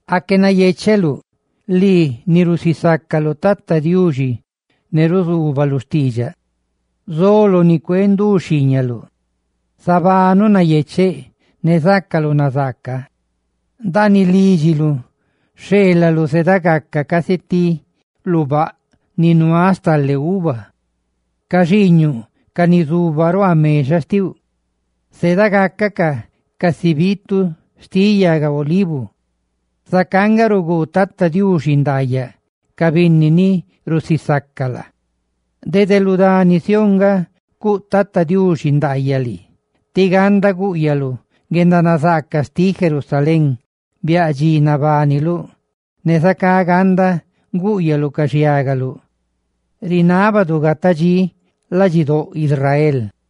Aque nayecheluꞌ lii, ni rusisácaluꞌ Tata Diuxine ruzuubaluꞌ xtiidxaꞌ. Zoloꞌ ni cuee ndu xhiiñaluꞌ, zabanuꞌ nayecheꞌ ne zácaluꞌ nazaaca. Ndaaniꞌ lídxiluꞌ, xheelaluꞌ zedagaca casi ti lubaꞌ ni nuáꞌ stale uva; ca xiiñuꞌ, ca ni zuba ruaa mexaꞌ xtiuꞌ, zedagacacaꞌ casi biitu xtiꞌ yaga olivu. Zacá nga ruguu Tata Diuxi ndaayaꞌ ca binni ni rusisaca laa. ¡Dede lu dani Sión nga cuꞌ Tata Diuxi ndaayaꞌ lii! ¡Tí ganda gúꞌyaluꞌ guendanazaaca xtiꞌ Jerusalén biaꞌ dxi nabániluꞌ! ¡Ne zacá ganda gúꞌyaluꞌ ca xhiágaluꞌ! ¡Rinábadu gata dxí ladxidóꞌ Israel!